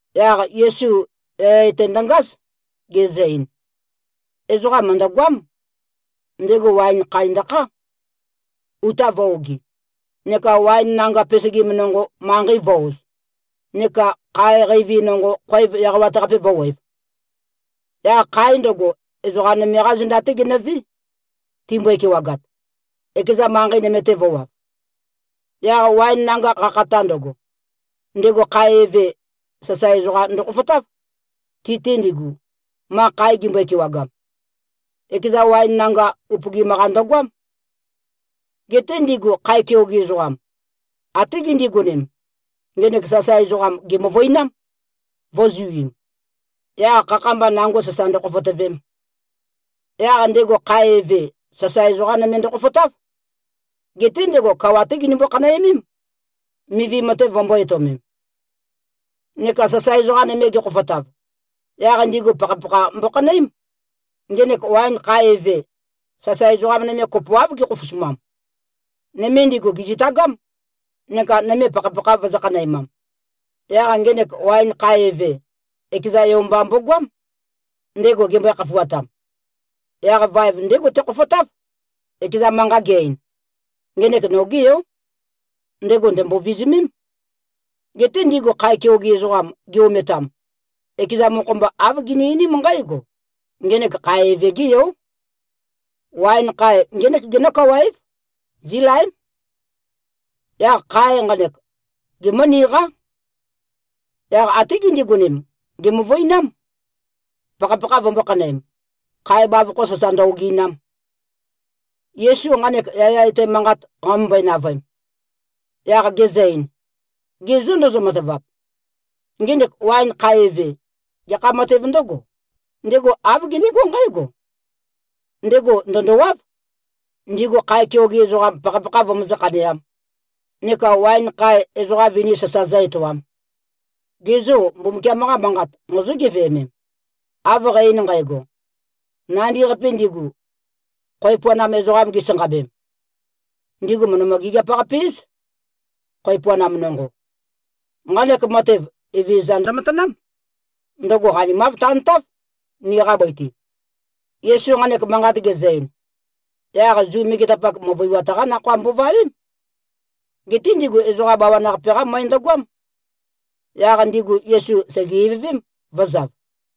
Yaq Yesu yaya etæ ndøngáz, gezø-ein, “Ezoqa mø̀ndøgoám. Ndego waen khae ndøkhá, uta vø̄-ogi, neka waen nanga pesegim nonqo, manqei vø̄-oz, neka khae qeivi nonqo, khoev eqawat-qape vø̄wev. Yaq khae ndøgo, ezoqā nøme-qá zenda-té genøvé, timbøe-kewagat, ekezan manqei nøme-te vø̄wav. Yaq waen nanga qakhata ndøgo, ndego khae eve, sasae ezoqam ndøkhofotáv, ti-te ndigu, ma khae gimbøe-kewagam. Ekeza waen nanga upøgim-qa ndøgoám. Geté ndigu khae keoge ezoqam, até gindigonem, ngenek sasae ezoqam gèmøvøinám, vø̄zuim, yaq khakha-mba nango sasa ndøkhofotøvem. Yaq ndego khae eve, sasae ezoqa nøme ndøkhofotáv. Geté ndego kawa-té ginømbo-khanæmém, mivi matev vømbō-etøomem. Neka sasae ezoqam nøme gekhofotav, yaq ndigu pakhapakha mbokhanøém. Ngenek waen khae eve, sasae ezoqa nøme kopoáv gekhofosumam. Nøme ndigu gèzitagám, neka nøme pakhapakha vøzø̄-khanæmam. Yaq ngenek waen khae eve, ekeza yo mba mbogoám, ndego gembøe-khafuatam. Yaq vaev ndégo tekhofotáv, ekeza manqa ge-ein, ‘Ngenek nogé yó. Ndego ndø̀mbo-vizumém.’ Geté ndigu khae keoge ezoqam gi-ometam, ekeza mokho-mba, āv gini-einím nqǽgo, ‘Ngenek khae eve-gé yó. Waen khae ngének genó-kawa-év. Zílaém. Yaq khae nqanek, gemǿniqá.’ Yaq até gindigonem, gèmøvøinám, pakhapakha vømbō-khanøem, khae bavokho sasa ndø-ogi꞉nam.” Yesu nqanek yaya etæ manqat qamømbøe-navøem, yaq gezø-ein, “Ge zô, ndozo-matavap? Ngenek waen khae eve, gekha matev ndǿgō? Ndego āv genégó nqǽgo: Ndego ndø̀ndowáv, ndigu khae keoge ezoqam pakhapakha vømøzǿ-khaneām, neka waen khae, ezoqa vini sasa zǿ-etoām. Ge zô, Mbumbukiam-qa Manqat mozó-geveømem, av qæ-ein nqægo? ‘Nandi-qapi ndigu, khoev puanam ezoqam gisanqabem, ndigu mø̀ndømø-gigiap-qape-éz, khoev puanam nonqo. Nqanek matev, Evezøza ndømatanám. Ndøgo qanimav tantáv, niqa bøi-te.’” Yesu nqanek manqat gezø-ein, yaq Zu megetapak, møvøiwat-qá nakhoa mbovawém. Geté ndigu ezoqa bawan-qape-qá møe ndøgoám. Yaq ndigu Yesu sège-ivøvém, vø̄zav.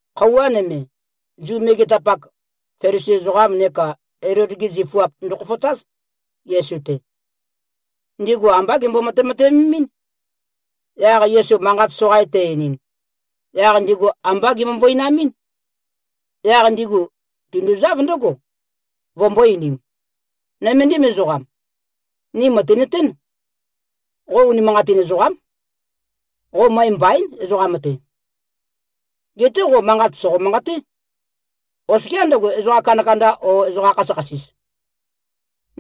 Khøuwa nøme, Zu megetapak, Felisi ezoqam neka Elod-gi zifuap ndøkhofotáz, Yesu-te. Ndigu ambá gembo-matemateømemín. Yaq Yesu manqat soqain te-einin, yaq ndigu ambá gemøvøinamɨ́n. Yaq ndigu tinduzáv ndǿgo, vømbō-einim, “Nøméndim ezoqam. Ni mø̀tinøtén. Qo unimanqatin ezoqám. Qo møe mbaín, ezoqam-te. Geté qo manqat sòqo-manqaté, oskiá ndøgo, ezoqa kandakanda o ezoqa khasøkhasis.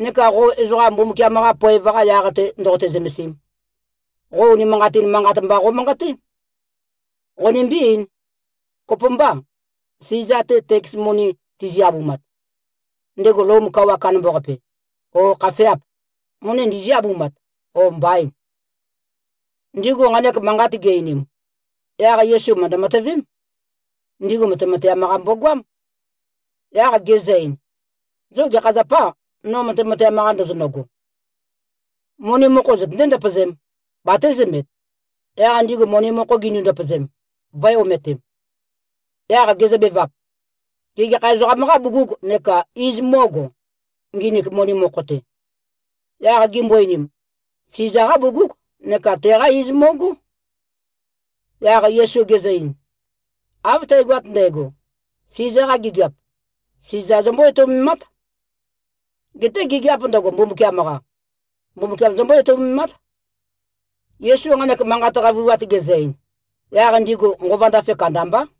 Neka qo ezoqa Mbumbukiam-qa poev-qa yaq-te ndoqote-zømesim, qo unimanqatin manqat mba qomanqaté. Qonimbí-eīn. Kopømbâ, Siza-te teks moni tizi-abumat, ndego Lom kawa kandambaqape, ó, khafeâp? Moni ndizí-abumat, ó, mbaîn?” Ndigu nqanek manqat gi-einim, yaq Yesu mø̀ndø-matøvém, ndigu matemateam-qa mbogoám, yaq gezø-ein, “Zo gekha zapâ, no matemateam-qa ndozonøgo? Moni mokho zøtøndé-ndøpøzēm, batézømet.” Yaq ndigu moni mokho gindu-ndøpøzem, vø̄e-ometem. Yaq gezøbevap, “Gê, gekha ezoqam-qâ bugug neka iz mó꞉go, nginik moni mokho-te?” Yaq gimbo-einim, “Siza-qá bugúg, neka teqá iz mo꞉gó.” Yaq Yesu gezø-ein, “Av tægoat ndægo, Siza-qa gigiap, Siza zombó-etoumemát. Geté gigiāp ndøgo, Mbumbukiam-qa, Mbumbukiam zombó-etoumemát.” Yesu nqanek manqa qavøiwat gezø-ein, yaq ndigu nqova ndafe kandambá.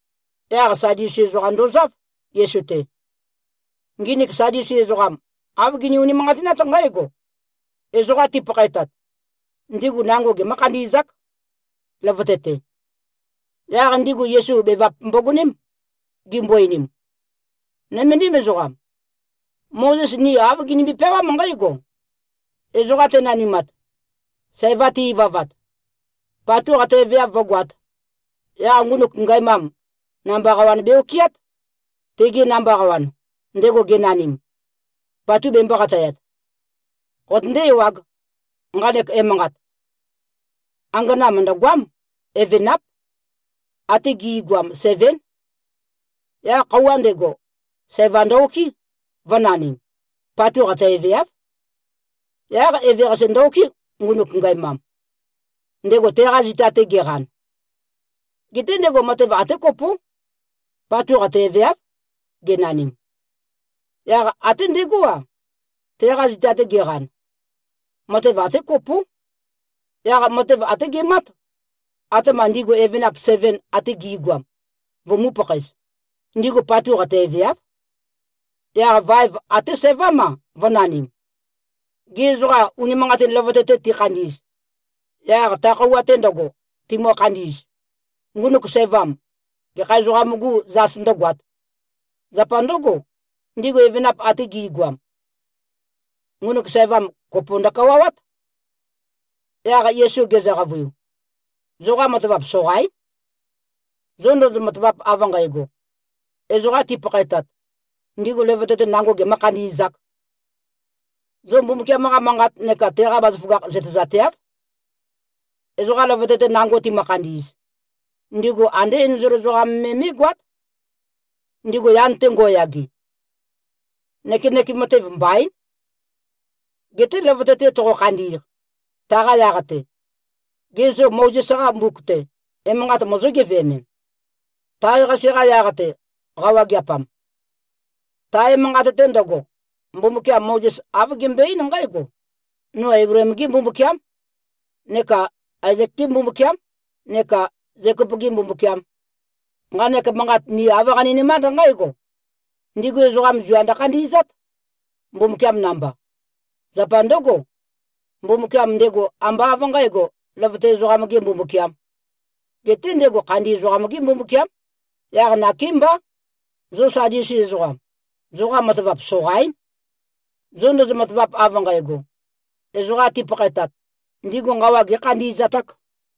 Yaq Sadusi ezoqam ndozáv, Yesu-te. Nginik Sadusi ezoqam, āv gini-unimanqatinát nqǽgo: Ezoqa tipakhaetat, ndigu nango gemǿ-khandi꞉zák, løvøte-te. Yaq ndigu Yesu bevap mbogoném, gimbo-einim, “Nøméndim ezoqam. Mozes ni āv ginimbi-peawám nqǽgo: Ezoqa tenanimat, sæva te-ivavat, patu qataeveav vǿgoāt, yaq ngunuk ngæmam, namba qawan be-okɨát, tege namba qawan, ndego genanim, patu bembō-qatayat. Qotøndé-ewāg, nqanek emanqat. Angana mø̀ndøgoám. Evenáp. Até gi꞉goam sevén. Yaq khøuwa ndego, sævam ndø-okɨ́, vø̄nanim. Patu qataeveáv. Yaq eveqase ndø-okɨ́, ngunuk ngæmam, ndego teqa zita-te geqan. Geté ndego matev até kopó, patu qataeveáv genanim. Yaq até ndegó-a, teqa zita-te geqan, matev até kopó. Yaq matev até gemát, atema ndigu evenap seven ate gi꞉goam vømū-pakhaez. Ndigu patu qataeveáv. Yaq vaev até sævám-a, vø̄nanim. Gê, ezoqa unimanqatin løvøte-te tikhandi꞉z, yaq ta khøuwa-te ndøgo, timø-khandi꞉z, ngunuk sævam, gekha ezoqam-gû zas ndǿgoāt? Zapa ndǿgo, ndigu evenap ate gi꞉goam, ngunuk sævam kopo ndøkawawát.” Yaq Yesu gezø-qavøiu, “Zoqa matavap soqaín, zo ndozo-matavap av nqægo, ezoqa tipakhaetat, ndigu løvøte-te nango gemø̄-khandi꞉zāk. Zo Mbumbukiam-qa Manqat neka teqa bazaføgakh zøtezateáv. Ezoqa løvøte-te nango timø-khandi꞉z, ndigu andé enzol ezoqam me mé꞉goát, ndigu yan-te ngo꞉yage. Nøkenøkem matev mbaín. Geté løvøte-te toqo-khandi꞉q, taqa yaq-te, gê, zo Mozes-qa mbuk-te, emanqat mozó-geveømem, tae-qase-qa yaq-te, qawageapam? Ta emanqat-te ndøgo, Mbumbukiam Mozes āv gembøe-eín nqǽgo, ‘No Eibleem-gé Mbumbukiám, neka Aezek-gé Mbumbukiám, neka Zekop-gē Mbumbukiām.’ Nqanek manqat ni āv qaninømánd nqǽgo: Ndigu ezoqam zua ndøkhandi꞉zát, Mbumbukiam namba. Zapa ndǿgo, Mbumbukiam ndego ambá av nqǣgo, løvøte ezoqam-gē Mbumbukiām, geté ndego khandi ezoqam-gé Mbumbukiám. Yaq nakémbá, zo Sadusi ezoqam, zoqa matavap soqaín, zo ndozo-matavap, av nqægo, ezoqa tipakhaetat, ndigu nqawa gēkhandi꞉zatāk.”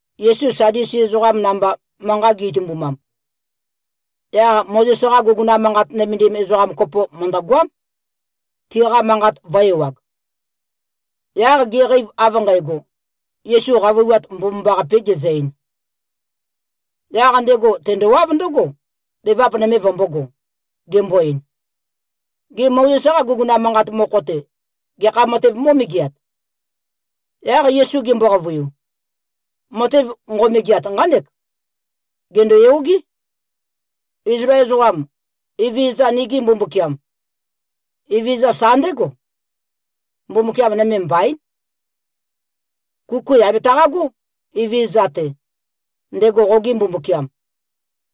Yesu Sadusi ezoqa namba manqa gi-itumbumam, yaq Mozes-qa guguna manqat nømendim ezoqa kopo mø̀ndøgoám, tiqa manqat vø̄-ewag. Yaq geqeiv av nqægo, Yesu qavøiwat mbomambaqapē gezø-ein, yaq ndego tendowáv ndǿgo, bevap nøme vømbōgo, gembo-ein, “Gê, Mozes-qa guguna manqat mokho-te, gekha matēv mó꞉megeat?” Yaq Yesu gembo-qavøiu, “Matev nqo꞉megeat nqánek, ‘Gèndoyogé, Izlael ezoqam! Evezøza, nigi Mbumbukiam, Evezøza sa ndégo. Mbumbukiam nøme mbaín. Kuku yà betaqagó, Evezøza-te, ndego qoge Mbumbukiam,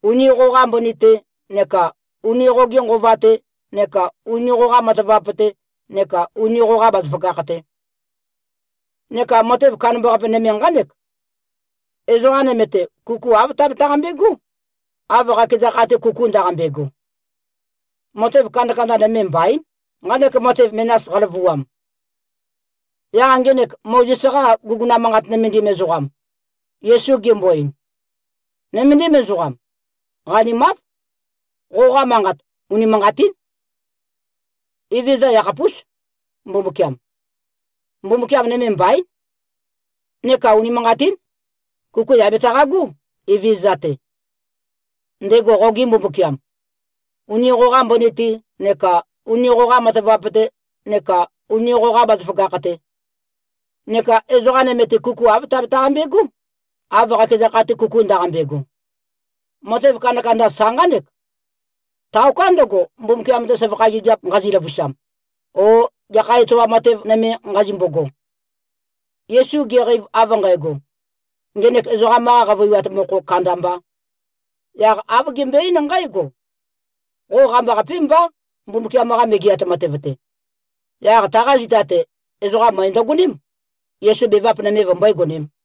uni qoqa mbøni-te neka uni qoge nqova-te neka uni qoqa matavap-te neka uni qoqa bazaføgakh-te.’ Neka matev kandambaqape nøme nqánek, ‘Ezoqa nøme-te, kuku āv tabetaqambe꞉gó, av qakeza kha-te kuku ndaqambe꞉go.’ Matev kandakanda nøme mbaín, nqanek matev menas qaløvuam.” Yaq ngenek Mozes-qa guguna manqat nømendim ezoqam, Yesu gembo-ein, “Nøméndim ezoqam. Qanimáv. Qoqa manqat unimanqatín. Evezøza yakhapús, Mbumbukiam. Mbumbukiam nøme mbaín. Neka unimanqatín. Kuku yà betaqagó, Evezøza-te, ndego qoge Mbumbukiam, uni qoqa mbøni-te neka uni qoqa matavap-te neka uni qoqa bazaføgakh-te. Neka ezoqa nøme-te, kuku āv tabetaqambe꞉gó, av qakeza kha-te kuku ndaqambe꞉go. Matev kandakanda sa nqánek. Taoká ndøgo, Mbumbukiam-te søvakha gigiap nqazi-løvusam, o gekha etoam matev nøme nqazimbogo.” Yesu geqeiv av nqægo, ngenek ezoqam-qa qavøiwat mokho kandambā, yaq āv gembøe-eín nqǽgo, “Qo qambaqapé mbá, Mbumbukiam-qa Megeat Matev-te.” Yaq taqa zita-te, ezoqa møe ndøgoném, Yesu bevap nøme vømbøé-gonēm.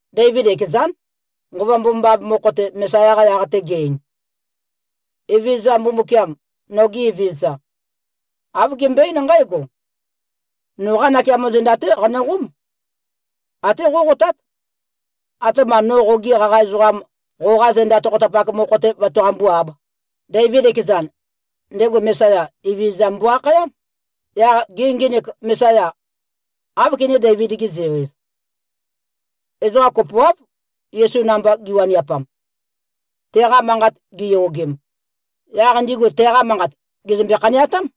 Deivid ekezán, Nqova Mbomambaqape mokho-te, Mesaya-qa yaq-te ge꞉-ein: Evezøza Mbumbukiam, noge Evezøza, āv gembøe-eín nqǽgo, ‘Noqá nakeamo zenda-té qanøqóm. Até qóqotát, atema no qogi qaqa ezoqam qoqa zenda tokhotapak mokho-te vøtaqambú-āb.’ Deivid ekezan, ndego Mesaya, Evezøza mbo-akhayám. Yaq gê, ngenek Mesaya, áv kené-Deivid-ge-zeo-ev?” Ezoqa kopoáv, Yesu namba giwaniapam, teqa manqat giyogem. Yaq ndigu teqa manqat gèzømbe-khaneatám.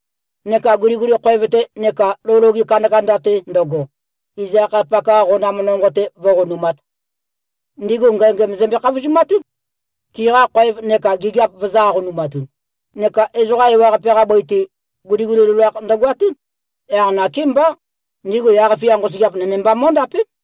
neka guliguli khoev-te neka lou loge kandakanda-te ndøgo, iz akhayapak-qa qonam nonqo-te vǿqonumāt. Ndigu ngængæm zømbe-khavozumatún, tiqa khoev neka gigiap vøzø̄-aqonumatun. Neka ezoqa ewaqape-qa bøi-te, guliguli loloakh ndøgoatún. Yaq nakémbá ndigu yaq-fia nqosøgeap, nøme mba mó꞉ndapém.”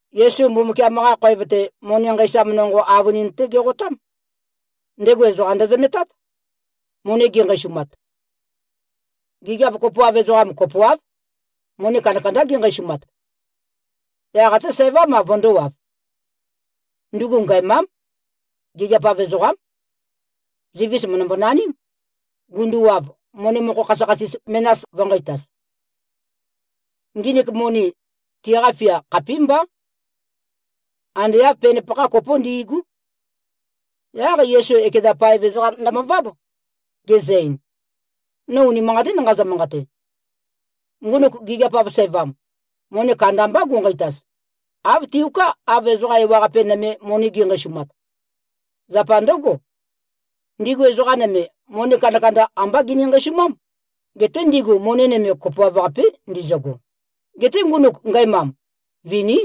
Yesu Mbumbukiam-qa khoev-te, moni nqeisam nonqo avønin-té geqotám. Ndego ezoqa ndøzømetát, moni ginqeisumat. Gigiap kopoav ezoqam kopoáv, moni kandakandá ginqeisumat. Yaq até sævám-a vøndōwav. Ndugu ngæmám. Gigiap-av ezoqám. Zivis mø̀ndømbo-naním. Gunduwav, moni mokho khasøkhasis menas vø̄nqeitaz. Nginik moni, tiqa fia khapímbá. Ande āv penpakha kopó ndi꞉gú. Yaq Yesu ekeza paev ezoqam ndømøváb, gezø-ein, “No unimanqatín nqazø-manqate. Ngunuk gigiap-av sævam, moni kandambá gu꞉nqeitaz, āv tiuká, av ezoqa ewaqape nøme, moni gi꞉nqeisumat. Zapa ndǿgo, ndigu ezoqa nøme, moni kandakanda ambá gini-nqeisumám. Geté ndigu moni nøme kopoav-qapí ndizøgo. Geté ngunuk ngæmam, viní.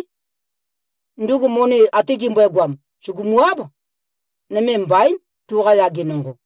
Ndugu moni ate gimbøegoam, sùgumu-áb. Nøme mbaín, tuqa yage nonqo.”